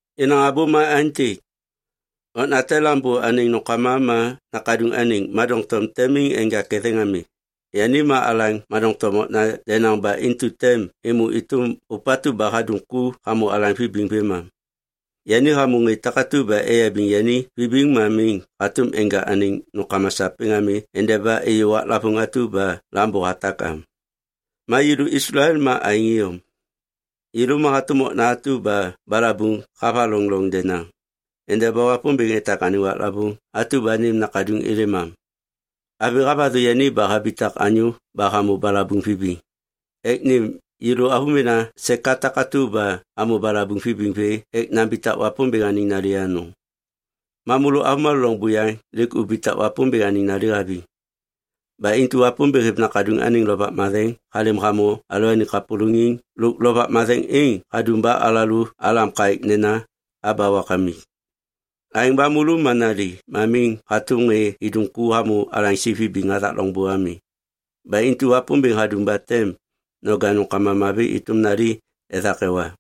Yenaŋ abô ma aêntêk. Okna te lambô anêŋ nômkama ma nakaduŋ anêŋ ma doŋtom tem miŋ enja ketheŋ ami. Yani ma alaŋ ma doŋtom okna denaŋ ba intu tem êmô êtôm ôpatu ba hadum ku hamô alaŋ vibiŋ vêmam. Yani hamô ŋê takatu ba eyabiŋ yani vibiŋ ma miŋ hatôm enja anêŋ nômkama sapêŋ ami endeba êyô waklavôŋ atu ba lambô hatak am. Ma yêlô Islael ma aêŋ iyom. Yêlô ma hatôm okna atu ba balabuŋ havaloŋ loŋ denaŋ endeba Wapômbêŋ etak anêŋ waklavôŋ atu ba nêm Nakaduŋ êlêm am. Avi havathu yani ba habitak anyô ba hamô balabuŋ vibiŋ ek nêm yêlô avômena seka takatu ba amô balabuŋ vibiŋ vê ek nambitak Wapômbêŋ anêŋ nali anôŋ. Ma môlô avômalô loŋ buyaŋ lêk ubitak Wapômbêŋ anêŋ nali haviŋ. Ba intu Wapômbêŋ hêv Nakaduŋ anêŋ Lovak Matheŋ halêm hamô alalôaniŋ kapôlôŋiŋ lôk Lovak Matheŋ êŋ hadum ba alalô alam kaêk nena, “Aba wakamik.” Aêŋ ba môlô ma nali ma miŋ hatôm ŋê idum ku hamô alaŋsi vibiŋ hathak loŋbô ami. Ba intu Wapômbêŋ hadum ba tem noja nômkama mavi êtôm nali ethak ewa.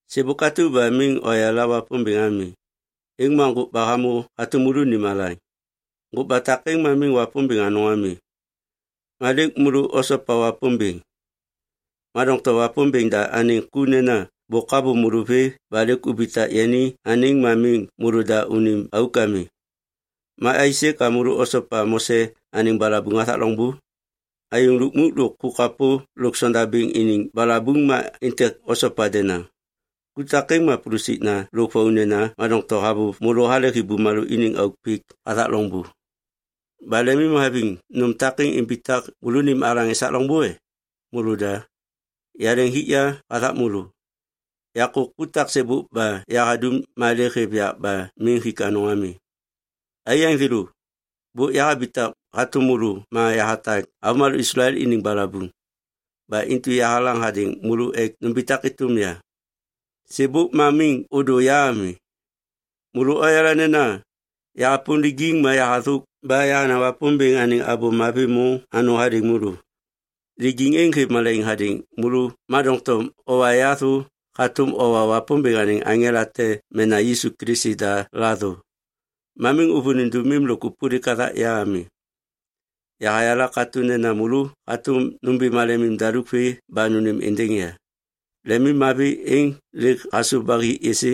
Sêbôk atu ba miŋ oyala Wapômbêŋ ami, êŋ ma ŋgôkba hamô hatôm môlônim alaŋ. Ŋgôkba takêŋ ma miŋ wapômbêŋ anôŋ ami. Ma lêk môlô osopa Wapômbêŋ. Ma doŋtom Wapômbêŋ da anêŋ ku nena bôk havôv môlô vê ba lêk ubitak yani anêŋ ma miŋ môlôda unim auk ami. Ma aisê ka môlô osopa Mose anêŋ balabuŋ hathak loŋbô? Ayôŋ lukmuk lôk ku kapô lôk sondabêŋ iniŋ balabuŋ ma êntêk osopa denaŋ. Ku takêŋ ma pulusikna lôk vaunena ma doŋtom havôv môlô halehi bumalô iniŋ auk pik hathak loŋbô. Ba lemimhaviŋ nôm takêŋ imbitak môlônim alaŋ esak loŋbô e? Môlôda. Yaleŋ hik ya hathak môlô. Yakô ku taksêbôk ba yahadum ma lêk hêv yak ba miŋ hik anôŋ ami. Aiyaŋ thêlô, bôk yahabitak hatôm môlô ma yahatak avômalô Islael iniŋ balabuŋ. Ba intu yahalaŋ hadêŋ môlô ek numbitak êtôm ya. Sêbôk ma miŋ ôdô ya ami. Môlô oyala nena yahapôm lijiŋ ma yahathôk ba yahanaŋ Wapômbêŋ anêŋ Abô Mavi môŋ anôŋ hadêŋ môlô. Lijiŋ êŋ hêv malaiŋ hadêŋ môlô ma doŋtom owa ya thô hatôm owa Wapômbêŋ anêŋ aŋela te mena Yisu Kilisi da la thô. Ma miŋ ôvôliŋ dômim lôk ôpôlik hathak ya ami. Yahayala katô nena môlô hatôm nômbi malemim daluk vê ba nônêm êndêŋ ya. Lemimmavi êŋ lêk hasôv ba hi êsê?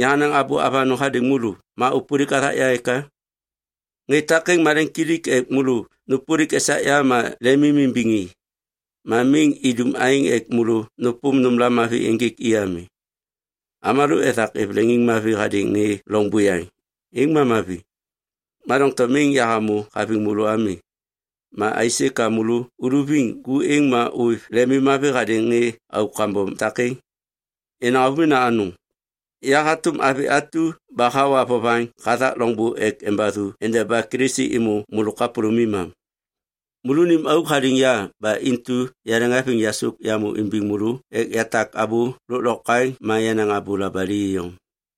Yahanaŋ abô avanôŋ hadêŋ môlô ma ôpôlik hathak ya eka? Ŋê takêŋ maleŋiŋkilik ek môlô nôpôlik esak ya ma lemimimbiŋ i. Ma miŋ idum aêŋ ek môlô nôpôm nômla mavi ênjêk i ami. Avômalô ethak êv leŋiŋmavi hadêŋ ŋê loŋ buyaŋ, êŋ ma mavi. Ma doŋtom miŋ yahamô haviŋ môlô ami, ma aisê ka môlô uluviŋ ku êŋ ma ôêv lemimmavi hadêŋ ŋê auk kambom takêŋ? Yenaŋ avômena anôŋ, ya hatôm avi atu ba hawa vovaŋ hathak loŋbô ek embathu endeba Kilisi êmô môlô kapôlômim am. Môlônim auk haliŋ ya ba intu yaleŋhaviŋ yasôk yamô imbiŋ môlô ek yatak abô lôklokwaŋ ma yanaŋ abô labali iyom.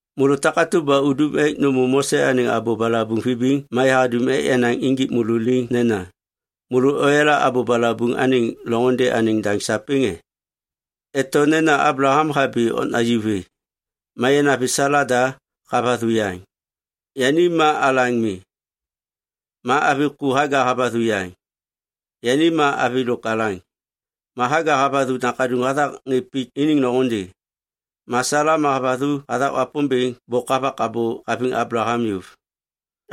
Môlô takatu ba udum ek nômô Mose anêŋ abô balabuŋ vibiŋ ma yahadum ek yanaŋ injik môlô liŋ nena, “Môlô oyala abô balabuŋ anêŋ loŋôndê anêŋ daŋ sapêŋ e?” Eto nena Ablaham habi okna ju vê. Ma yanavi Sala da havathu yaŋ, yani ma alaŋ mi. Ma avi ku Haga havathu yaŋ, yani ma avi lôk alaŋ. Ma Haga havathu nakaduŋ hathak ŋê pik iniŋ loŋôndê. Ma Sala ma havathu hathak Wapômbêŋ bôk havak abô haviŋ Ablaham yôv.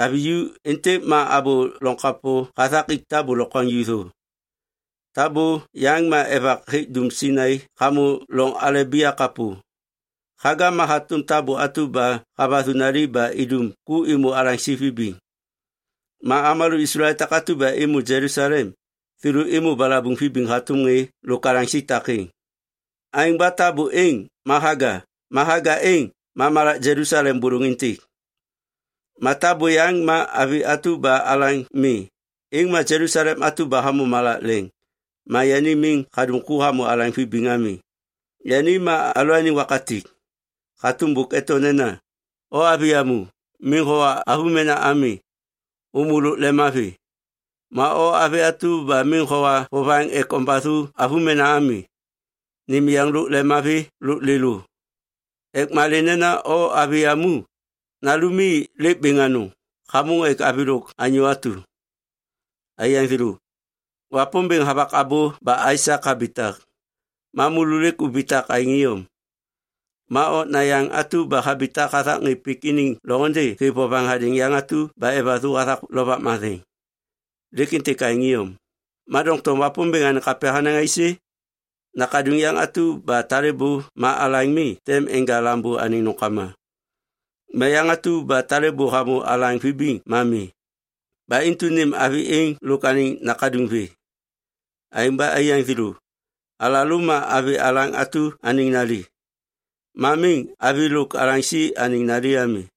Avi ju êntêk ma abô loŋ kapô hathak ik tabô lokwaŋju thô. Tabô yaŋ ma evak hêk dum Sainai hamô loŋ Alebia kapô. Haga ma hatôm tabô atu ba havathu nali ba idum ku êmô alaŋsi vibiŋ. Ma avômalô Islael takatu ba êmô Jelusalem, thêlô êmô balabuŋ vibiŋ hatôm ŋê lôk alaŋsi takêŋ. Aêŋ ba tabô êŋ ma Haga ma Haga êŋ ma malak Jelusalem bôlôŋ êntêk. Ma tabô yaŋ ma avi atu ba alaŋ mi, êŋ ma Jelusalem atu ba hamô malak leŋ ma yani miŋ hadum ku hamô alaŋ vibiŋ ami. Yani ma alalôaniŋ wakatik. Hatôm bôk eto nena, “O avi yamu, miŋ howa avômena ami, ômô lôk lemmavi. Ma o avi atu ba miŋ howa vovaŋ ek ombathu avômena ami, nêm yeŋ lôk lemmavi lôk lêlô, ek malê nena o avi yamu, nalumi lêk bêŋ anôŋ hamôŋ ek avi lôk anyô atu.” Aiyaŋ thêlô, Wapômbêŋ havak abô ba Aisak habitak. Ma môlô lêk ubitak aêŋ iyom. Ma okna yaŋ atu ba habitak hathak ŋê pik iniŋ loŋôndê hêv vovaŋ hadêŋ yaŋ atu ba evathu hathak Lovak Matheŋ. Lêk êntêk aêŋ iyom. Ma doŋtom Wapômbêŋ anêŋ kapya hanaŋ aisê? “Nakaduŋ yaŋ atu ba talêbô ma alaŋ mi tem enja lambô anêŋ nômkama. Ma yaŋ atu ba talêbô hamô alaŋ vibiŋ ma mi. Ba intu nêm avi êŋ lôk anêŋ nakaduŋ vê.” Aêŋ ba aiyaŋ thêlô, alalô ma avi alaŋ atu anêŋ nali. Ma miŋ avi lôk alaŋsi anêŋ nali ami.